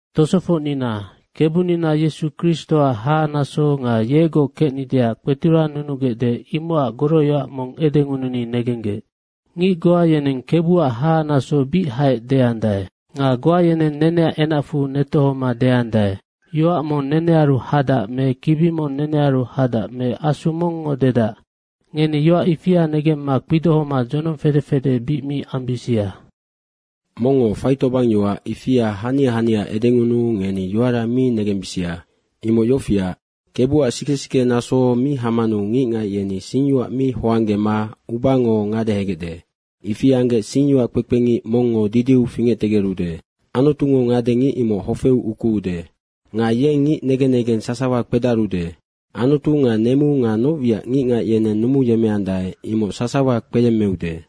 Tosofocnina, Kebunina Yesu Kristoac haha naso nga yegoc kecnideac kpeturannunugecde, imocac goroyoac mong edengununi negenggec. Ngic goa yeneng Kebuac hahanaso bic haec deandae. Nga goa yeneng neneac enacfu netohoma deandae, “Yoac mong nenearu hadac me kibi mong nenearu hadac me asu mongngo dedac.” Ngeni yoac ifia negemma kpidohoma dzonong fede fede bic mi ambisia. Mongngo faitobangyoac ifia hania hania edengunuu ngeni yoara mi negembisia. Imoc yofiac, Kebuac sike sike naso mi hamanu ngicngac yeni singyoac mi hoanggema ubango ngadehegecde. Ifi anggec singyoac kpekpengic mongngo didiu fingectegerude. Anutungo ngade ngic imoc hofeu ukuude. Nga yeng ngic negen negeng sasawa kpedarude. Anutu nga nemu nga noc wiac ngicngac yeneng numuyemmeandae, imoc sasawa kpeyemmeude.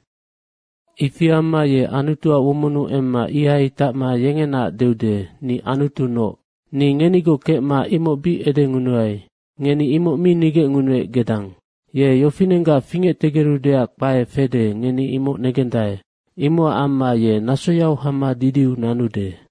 Ifi amma ye Anutuac womonnu emma ihai tacma yengenaac deude, “Ni anutunoc.” Ni ngenigoc kecma imoc bic edengunuai. Ngeni imoc bic nigecngunuec gedang. Ye yofinenggac fingectegerudeac kpae fede, ngeni imoc negendae. Imocac amma ye nasoyau hama didiu nanude.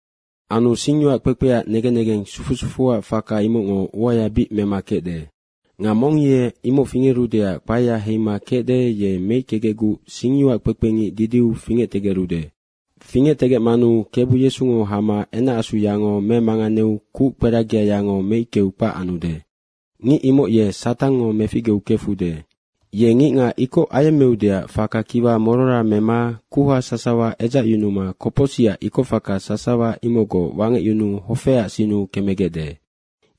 Anu singyoac kpekpeac negen negeng sufu sufuac faka, imocngo uaya bic mema kecde. Nga mong ye imoc fingerudeac kpaea heima kecde, ye meickegecguc singyoac kpekpe ngic didiu fingectegerude. Fingectegecmanu Kebu Yesungo hama enacasuyango memanganeu kuckperagiayango meickeu kpac anude. Ngic imoc ye Satangngo meficgeu kefude. Ye ngicngac ikoc ayemmeudeac faka kiwa morora mema kuha sasawa edzacyunuma kopocsicac ikocfaka sasawa imocgoc wangecyunuu hofeac sinnu kemegecde.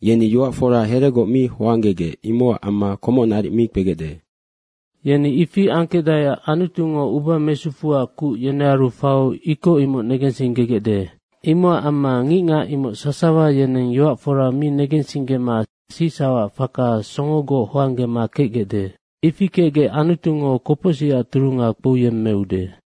Yeni yoac fora heregoc mi hoanggegec, imocac amma komoc naric mi kpegecde. Yeni ifi angkecdaeac Anutungo uba mesufuac kuc yenearu faiu ikoc imoc negensinggegecde. Imocac amma ngicngac imoc sasawa yeneng yoac fora mi negensinggema sicsaucac faka songogoc hoanggema kecdae. Ifi kecgec Anutungo kopocsicac turunga kpouyemmeude.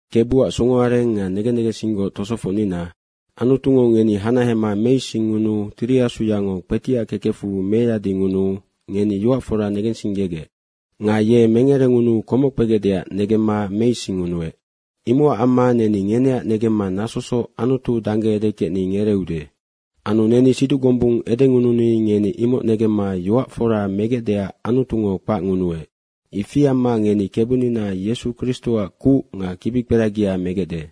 Kebuac songo areng nga negen negensinggoc tosofocnina, Anutungo ngeni hanahema meisingngunuu Tiri Asuyango kpetiac kekecfu meyadingunuu ngeni yoac fora negensinggegec. Nga ye mengerengunuu komoc kpegecdeac negemma meisingngunuec. Imocac amma neni ngeneac negemma nasosoc Anutu dangge edekecni ngereeude. Anu neni siduc gombung edengununi ngeni imoc negemma yoac fora megecdeac Anutungo kpacngunuec. Ifi amma ngeni Kebunina Yesu Kristoac kuc nga kibikperagia megecde.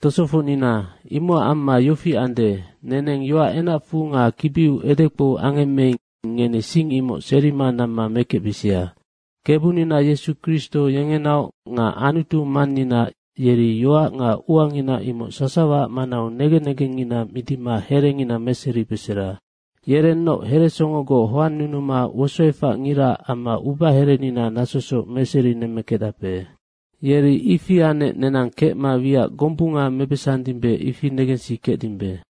Tosofocnina, imocac amma yofi ande, neneng yoac enacfu nga kibiu edekpou angemmeing, ngeni sing imoc serima namma mekecbisia. Kebunina Yesu Kristo yengenaoc nga Anutu Mannina yeri yoac nga uangina imoc sasawaac manau negen negengngina midima herengina meseribesera. Yerennoc heresongogoc hoannunuma wosoefacngiraac amma ubaherenina nasosoc meserinemmekecdape. Yeri ifi anec nenang kecma wiac gombunga mebesandimbe, ifi negensikecdimbe.